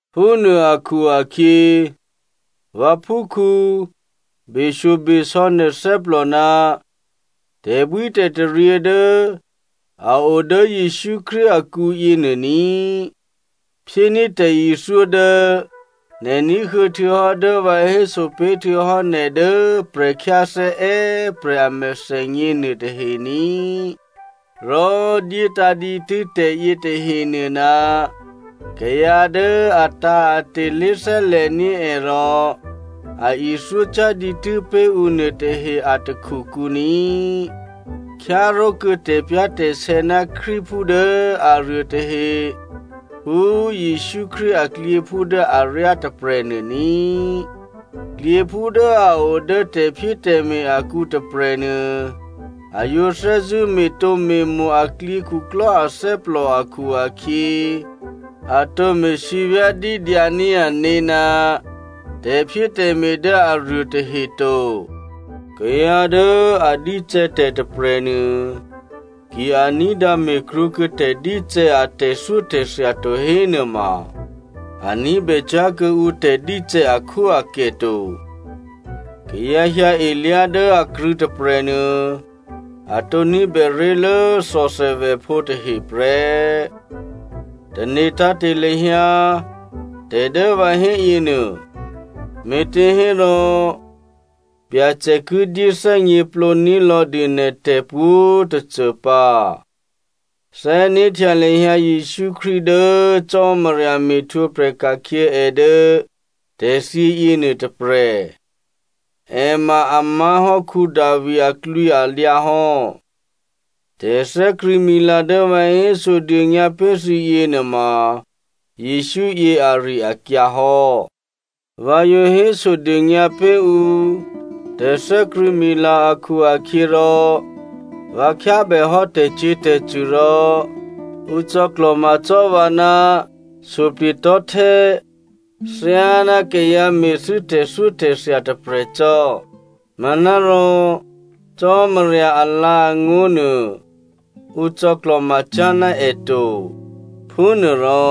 Phúnuô akhu-akhyě vǎphúkhǔ꤮ beshyobesò̌ nè̤ thè́plò ná tè̤bwítè̤taryě dố a o dố Jesǔ Krístu akǔyě nuô ní꤮. Phyéní̤ tè̤ithyó dố nè̤ ní̤huô̌ htuô̌hò́ dố vǎ hésopé̤ htuô̌hò́ nè̤ dố prè̤khyáthè́ è́prè̤ a mèthènyě nuôtahe ní꤮, rò dyétǎ̤ dǐtû́ tè̤ yětahenuô ná kayǎ dố atǎ̤ate̤ lé̤thè́lè̤ní̤ è rò a ithyócyá̤ dǐtû́ pé̤ ǔ nuôtahe a takhukǔ ní꤮. Khyáró̤kuô̌ tè̤pyá̤tè̤sè̌ ná Krístuphú dố aruô tahe phú Jesǔ Krístu aklyěphú dố aryá tôprè̤nuô ní꤮. Klyěphú dố a o dố tè̤phyétè̤me̤ akǔ tôprè̤nuô, a yǒ thè́zṳ̂́ me̤tǒme̤mo̤ a klyěkhuklò́ athè́plò akhu-akhyě, a tǒ me̤ sívyá̤dídyǎ ní̤ ané̤ ná tè̤phyétè̤me̤ dố aruô tahe to. Kayǎ dố a dícè̌ tè̤ tôprè̤nuô, ki a ní̤dǎ me̤krwǒkuô̌ tè̤dícè̌ a tè̤thyótè̤thya to hénuôma a ní̤bècyá̤ kuô̌ǔ tè̤dícè̌ akhwóakè to. Kayǎ hyǎelyá̤ dố akrṳ̂̌ tôprè̤nuô, a tǒ ní̤bè ré̤lố thòthèvèphǒ tahe prè́. Tane̤ tǎ̤te̤ lahyǎ tè̤ dố vǎ héyěnuô, me̤těhérò Byacè ki dyéthè́gněplǒ ní̤lò̤̌dû nè̤ tè̤pwǒ̤꤮ tôcô pǎ. Thè́né̤htya lahyǎ Jesǔ Krístu dố Cò́marya me̤htwǒprè̤ ka̤khyě è dố tè̤thyě yěnuô tôprè̤. È ma a má̤hò́ Davi aklwǐalyǎ hò́. Tè̤thè́krṳ̂̌mila dố vǎ hésodônyǎ pé̤ thǐ yěnuôma Jesǔ yě ari-akyǎ hò́. Vǎ yǒ hésodônyǎ pé̤ ǔ tè̤thè́krṳ̂̌mila akhu-akhyěrò, vǎ khyábèhò́ tè̤cyě̤tè̤cṳ̂ rò ǔ cò̌klò̤ma cò́ vǎ ná suplye̤tò̤́htè́ thyáná kayǎ me̤thû́ tè̤thyótè̤thya tôprè̤ cò́. Manárò Cò́marya alǎ̤angó̤ nuô ǔ cò̌klò̤macyá̤ ná è to. Phúnuôrò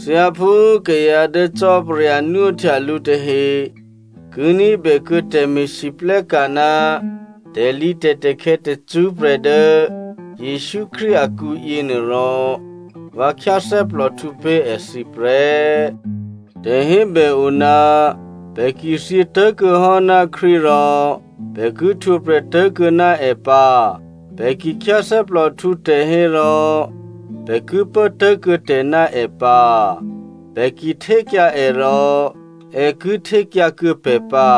thyáphú kayǎ dố Cò́marya nwóhtya lǔ tahe ki ní̤bèkuô̌ tè̤me̤lwóhteka̤ ná tè̤lǐtè̤takhè̌ tacṳ́prè̤ dố Jesǔ Krístu akǔ yěnuô rò, vǎ khyáthè́plòhtǔ pé̤ èthǐ prè́. Tè̤hébè o, “Pè̤ ki thyětố̤kuô̌ hò́ ná Krístu rò pè̤ ki htwǒprè̤ tố̤kuô̌ ná è pǎ. Pè̤ ki khyáthè́plòhtǔ tè̤ hérò pè̤ ki pố tố̤kuô̌ tè̤ ná è pǎ, Pè̤ ki htékyǎ è rò è ki htékyǎkuô̌ pè̤ pǎ.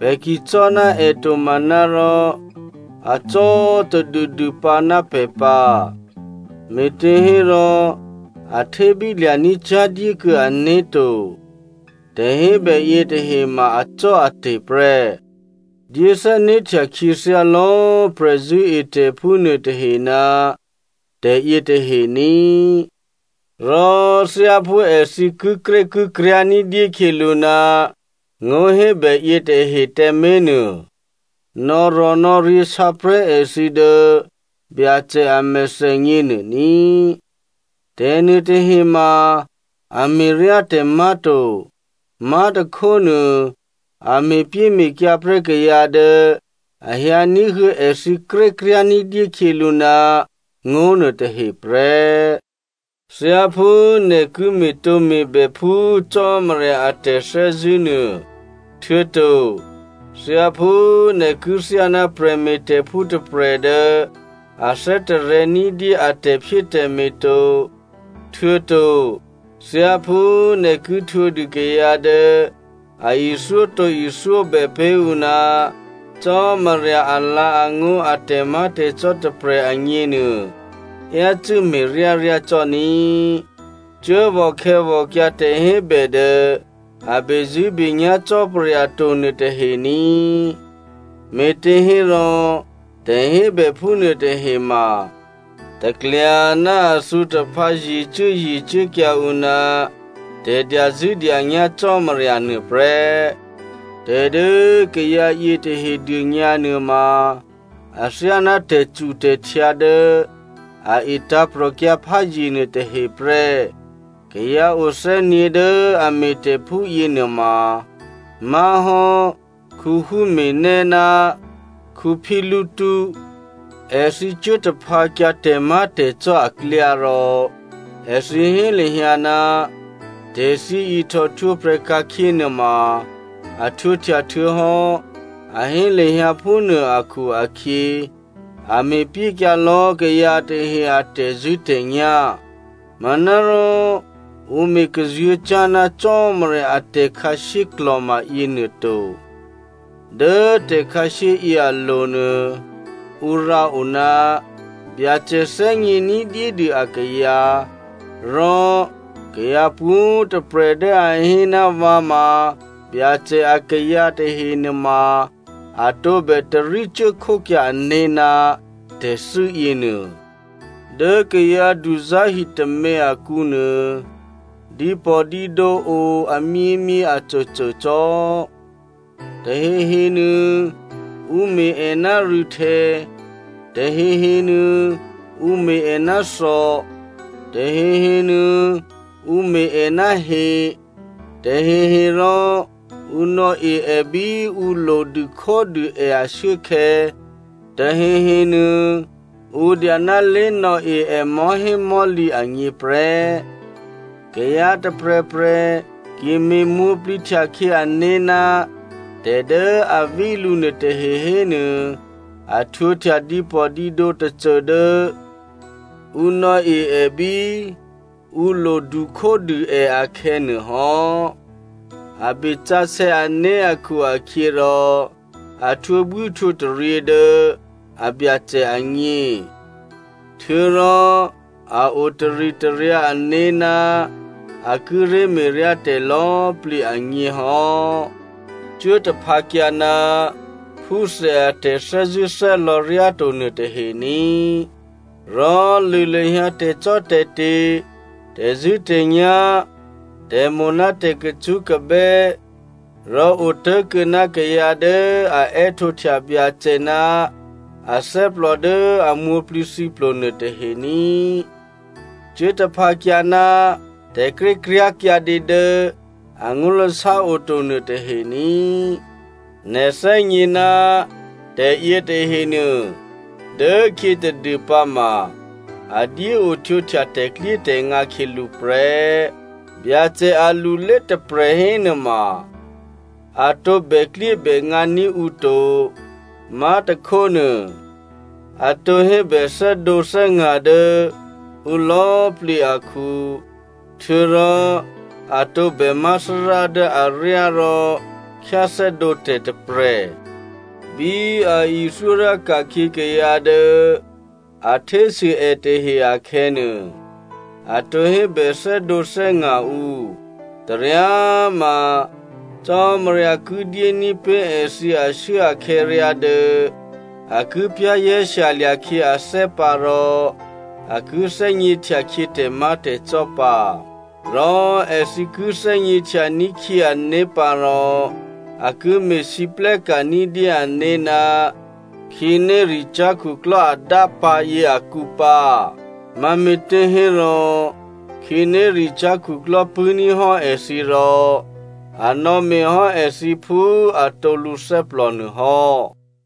Pè̤ ki cò́ ná è to manárò acò́꤮ tadûdû pǎ ná pè̤ pǎ, me̤těhérò a htébí lya̤ní̤ cyá̤dyékuô̌ ané̤to.” Tè̤hébè yětahe ma acò́ate̤ prè́. Dyé thè́né̤htya khyěthyá lò̌꤮ prè̤zṳ̂́etè̤phú nuôtahe ná tè̤yětahe ní꤮, rò thyáphú èthǐ kikrékikryá̤ ní̤dyé khyělǔ ná ngó̤hébè yětahe tǎmé̤nuô nò̌rò̤nò̌ryě̤ sǎprè̤́ èthǐ dố Byacè a mèthènyě nuô ní꤮. Tè̤nuôtahe ma a me̤ryá tè̤ má̤to. Má̤tôkhónuô a me̤pyéme̤kyǎ prè́ kayǎ dố a hyǎ ní̤huô̌ èthǐ krékryá̤ ní̤dyé khyělǔ ná ngó̤ nuôtahe prè́. Thyáphú nè̤ ki me̤tǒme̤bè phú Cò́marya a tè̤thè́zṳ̂́ nuô, htuô̌to thyáphú nè̤ ki thyáná prè̤me̤tè̤phú tôprè̤ dố a thè́tarè̤̌ ní̤dyé a tè̤phyétè̤me̤ to, htuô̌to thyáphú nè̤ ki htwǒdû kayǎ dố a ithyótǒ ithyóbè pé̤ ǔ ná Cò́marya alǎ̤angó̤ a tè̤má̤tè̤cò́ tôprè̤ agněnuô, yácû́ me̤ryáryá cò́ ní꤮. Cuốvò̤ khè̌vò̤kyǎ tè̤hébè dố a bezṳ̂́benyá̤ Cò́marya to nuôtahe ní꤮, me̤těhérò tè̤hébè phúnuô tahe ma taklya ná a thǔ taphǎ ye̤cuố ye̤cuốkyǎ ǔ ná tè̤dyazṳ̂́dyanyá̤ Cò́marya nuôprè́. Tè̤ dố kayǎ yětahe dônyǎ nuôma, athyáná tè̤cutè̤htyǎ dố a e tǎ̤prò̤kyǎ pházye nuôtahe prè́. Kayǎ o thè́gně dố a me̤tè̤ phúyě nuôma má̤hò́ Hymenaeo ná Phileto. Èthǐ cuố taphǎkyǎ tè̤má̤tè̤cò́ aklyá rò èthǐ hé lahyǎ, tè̤thyě ihtò htwǒprè̤ ka̤khyě nuôma a htwǒhtya htuô̌hò́ a hé lahyǎ phúnuô akhu-akhyě, a me̤pyékyǎ lò̌ kayǎ tahe a tè̤zṳ̂́tè̤nyá̤. Manárò ǔ me̤ kazuô̤̌cyá̤ ná Cò́marya a tè̤khǎshyé klò̤ma yěnuô to. Dố tè̤khǎshyé yě alo̤nuô ǔ rǎo, “Byacè thè́gně ní̤dyédû akayǎ” rò “Kayǎ pwǒ̤꤮ tôprè̤ dố a hé ná vǎ ma Byacè akayǎ tahenuôma, a tǒbè tarí cuốkhókyǎ ané̤ ná tè̤thû́ yěnuô.” Dố kayǎ duzá̤ hitômě akǔnuô dǐpò̤dǐdǒ o amyěmyě acôcô cò́. Tahehe nuô ǔ me̤ è ná rû̌htè̌, tahehe nuô ǔ me̤ è ná thò, tahehenuô ǔ me̤ è ná he. Tahehe rò ǔ nò̌e è bí ǔ lodu khódû è ashuốkhè̌, tahehe nuô, ǔ dya ná lé̤nò̌e è mò̤́hémò̤́lǐ agně prè́. Kayǎ tôprè̤prè̤ ki me̤ mwǒ̤plǐ htyakhyě ané̤ ná tè̤ dố a ví lǔ nuôtahe hénuô, a htwǒhtya dǐpò̤dǐdǒ tôcô dố ǔ nò̌e è bí ǔ lodu khódû è akhè̌nuô hò́. A besǎsè̌ ané̤ akhu-akhyěrò, a htwǒbwíhtwǒtaryě dố a Byacè agně. Htuô̌rò a o taritaryǎ ané̤ ná a kíré̤ me̤ryá tè̤ lò̌꤮ plǐ agně hò́. Cuố taphǎkyǎ ná phúthè a tè̤thè́zṳ̂́thè́lò̌ ryáto nuôtahe ní꤮, rò lṳ̂ lahyǎ tè̤cò́tè̤te̤, tè̤zṳ̂́tè̤nyá̤, tè̤mo̤ ná tè̤kacṳ́kabè́, rò otố̤kuô̌ ná kayǎ dố a è́htǒhtya Byacè ná athè́plò dố a mwǒ̤plǐthǐplo nuôtahe ní꤮. Cuố taphǎkyǎ ná tè̤krékryá̤ kyǎdě dố angó̤lasá oto nuôtahe ní꤮. Nè̤ thè́gně ná tè̤ yětahenuô dốkhyě tadû pǎma a dyéo htwǒhtya tè̤klyétè̤ngǎ khyělǔ prè́. Byacè alulé tôprè̤ hénuôma a tǒ bèklyébèngǎ ní̤ ǔ to, má̤tôkhónuô, a tǒ hébè thè́dǒthè́nga̤ dố ǔ lò̌plǐ akhu, htuô̌rò a tǒbè má̤ Thárá dố aryá rò khyáthè́dǒ tè̤ tôprè̤. Bí a ithyó ryá ka̤khyě kayǎ dố a htésû è tahe akhè̌nuô, a tǒ hébè thè́dǒthè́nga̤ ǔ. Taryá꤮ ma, Cò́marya ki dyéní̤ pé̤ èthǐ ashuốakhè̌ ryá dố a ki za̤ ní̤dûkhyě ané̤ pǎ rò a ki thè́gně htyakhyě tè̤má̤tè̤cò́ pǎ. Rò èthǐ ki thè́gněhtya ní̤khyě ané̤ pǎ rò a ki me̤lwóhteka̤ ní̤dyé ané̤ ná khǐnéricyá̤ khuklò́ adápǎ̤ yě akǔ pǎ. Mame̤těhérò khǐnéricyá̤ khuklò́ pṳ̂́ní̤ hò́ èthǐ rò a nò̌me̤ hò́ èthǐ phú atǒ lǔthè́plò nuô hò́.